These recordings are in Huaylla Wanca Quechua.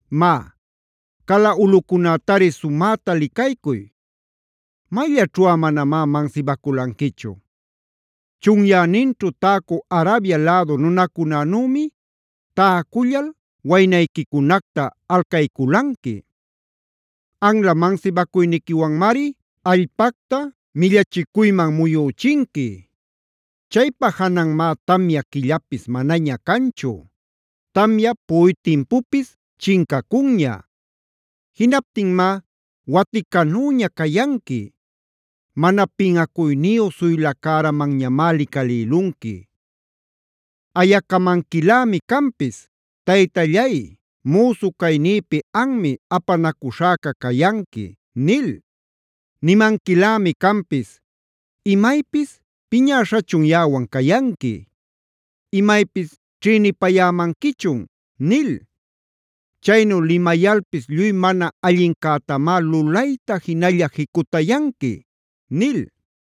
Má, cala ulꞌucunätari sumäta licaycuy; ¿mayllaćhuꞌa manamá mansibaculanquichu?b Chunyäninćhu täcü Arabia lädu nunacunänümi täcullal waynayquicunacta alcayculanqui. Anla mansibacuyniquiwanmari allpacta millachicuyman muyüchinqui. Chaypa jananmá tamya quillapis manaña canchu; tamya puꞌuy timpupis chincacunña. Jinaptinmá waticanüña cayanqui; mana pinꞌacuyniyu suyla cäramanñamá licalïlunqui. Ayacamanquilämi canpis: ‘Taytallay, müsu caynïpi anmi apanacuśhäcac cayanqui’ nil. Nimanquilämi canpis: ‘¿Imaypis piñäśhachun yaꞌawan cayanqui? ¿Imaypis ćhïnipayämanquichun?’ nil. Chaynu limayalpis lluy mana allincätamá lulayta jinalla jicutayanqui” nil.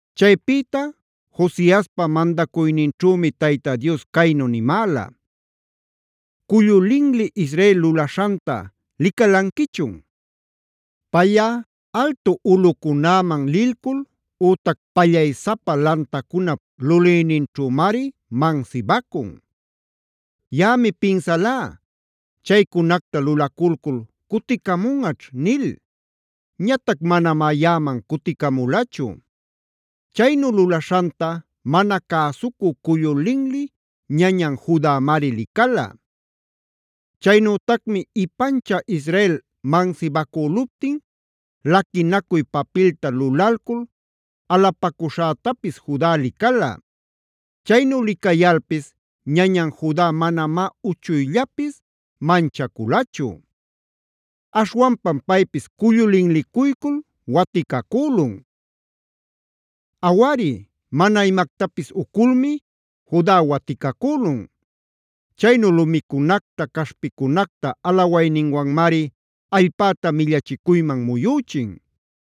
Chaypïta Josiaspad mandacuyninćhümi Tayta Dios caynu nimäla: “¿Cullu linli Israel lulaśhanta licalanquichun? Payꞌa altu ulꞌucunäman lilcul ütac pallaysapa lantacunap lulinninćhümari mansibacun. Yaꞌami pinsalá: ‘Chaycunacta lulaculcul cuticamunꞌaćh’ nil. Ñatac manamá yaꞌaman cuticamulachu. Chaynu lulaśhanta mana cäsucü cullu linli ñañan Judamari licala. Chaynütacmi ipanchä Israel mansibacüluptin laquinacuy papilta lulalcul alapacüśhätapis Juda licala. Chaynu licayalpis ñañan Juda manamá uchuyllapis manchaculachu; aśhwanpam paypis cullu linlicuycul waticacülun. Awari, mana imactapis uculmi Juda waticacülun. Chaynu lumicunacta, caśhpicunacta alawayninwanmari allpäta millachicuyman muyüchin.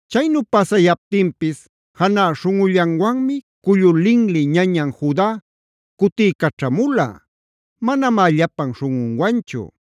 Chaynu pasayaptinpis janä śhunꞌullanwanmi cullu linli ñañan Juda cutiycaćhamula; manamá llapan śhunꞌunwanchu.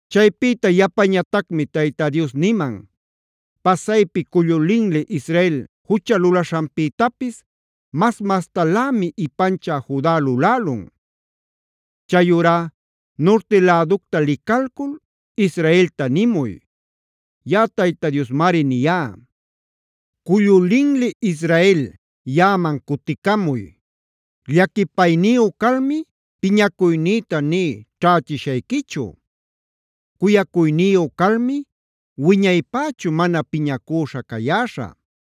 Chaypïta yapañatacmi Tayta Dios niman: “Pasaypi cullu linli Israel jucha lulaśhanpïtapis mas-mastalämi ipanchä Juda lulälun. Chayurá nurti läducta licalcul Israelta nimuy: “ ‘Yaꞌa Tayta Diosmari niyá: Cullu linli Israel, yaꞌaman cuticamuy. Llaquipayniyu calmi piñacuynïta nï ćhächishayquichu. Cuyacuyniyu calmi wiñaypächu mana piñacüśha cayäśhä.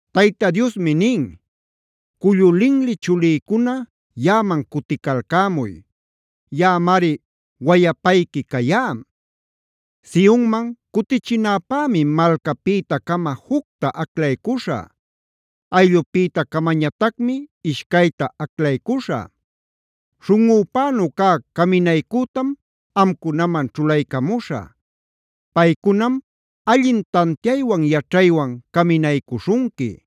Tayta Diosmi nin: “Cullu linli chulïcuna, yaꞌaman cuticalcämuy. Yaꞌamari wayapayqui cayá. Sionman cutichinäpämi malcapïta-cama jucta aclaycuśhä; ayllupïta-camañatacmi ishcayta aclaycuśhä. Śhunꞌüpänu cä caminaycütam amcunaman ćhulaycamuśhä. Paycunam allin tantiaywan yaćhaywan caminaycuśhunqui.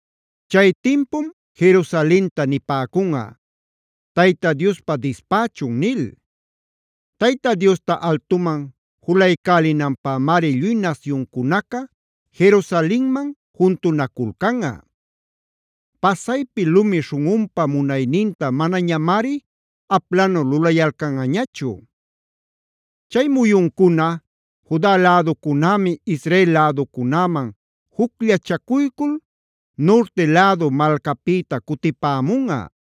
“Chay timpum Jerusalenta nipäcunꞌa: ‘Tayta Diospa dispächun’ nil. Tayta Diosta altuman juluycälinanpämari lluy nasyuncunaca Jerusalenman juntunaculcanꞌa. Pasaypi lumi śhunꞌunpa munayninta manañamari aplanu lulayalcanꞌañachu. “Chay muyuncuna Juda läducunämi Israel läducunäman jucllachacuycul nurti lädu malcapïta cutipämunꞌa.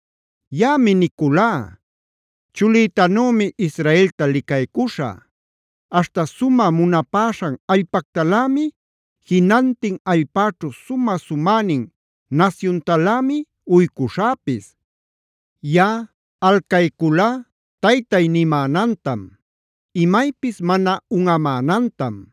“Yaꞌami niculá: Chulïtanümi Israelta licaycuśhä. Aśhta sumä munapäśhan allpactalämi jinantin allpäćhu sumä-sumänin nasyuntalämi uycuśhäpis. Yaꞌa alcayculá Taytay nimänantam; imaypis mana unꞌamänantam.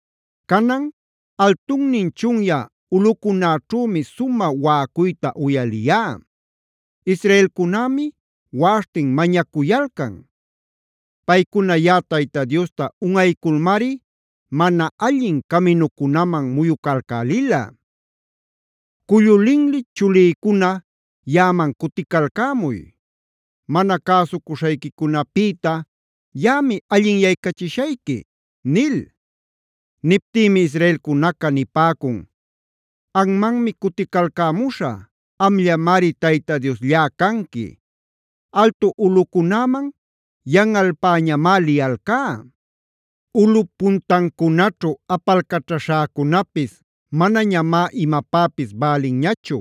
“Canan, altunnin chunyä ulꞌucunäćhümi sumä waꞌacuyta uyaliyá; israelcunämi waꞌaśhtin mañacuyalcan. Paycuna yaꞌa Tayta Diosta unꞌayculmari mana allin caminucunaman muyucalcälila. Cullu linli chulïcuna, yaꞌaman cuticalcämuy. Mana cäsucuśhayquicunapïta yaꞌami allinyaycachishayqui” nil. Niptinmi israelcunaca nipäcun: “Anmanmi cuticalcämuśhä; amllamari Tayta Diosllá canqui. Altu ulꞌucunäman yanꞌalpäñamá liyalcá; ulꞌup puntancunaćhu apalcaćhaśhäcunapis manañamá imapäpis bälinñachu.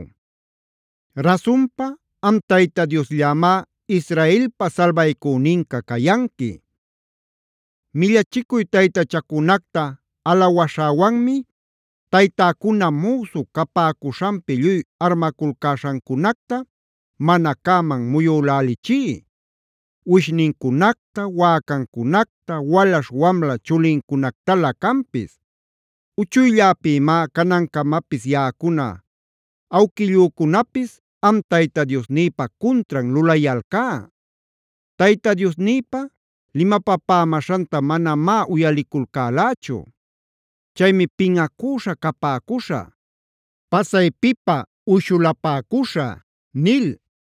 Rasunpa am Tayta Diosllamá Israelpa salbaycüninca cayanqui. “Millachicuy taytachacunacta alawaśhäwanmi taytäcuna müsu capäcuśhanpi lluy armaculcäśhancunacta mana cäman muyülälichí: uwishnincunacta, wäcancunacta, walaśh-wamla chulincunactalä canpis. Uchuylläpïmá canancamapis yaꞌacuna awquillücunapis am Tayta Diosnïpa cuntran lulayalcá; Tayta Diosnïpa limapapämäśhanta manamá uyaliculcälächu. Chaymi pinꞌacüśha capäcuśhä; pasaypipä uyshulapäcuśhä” nil.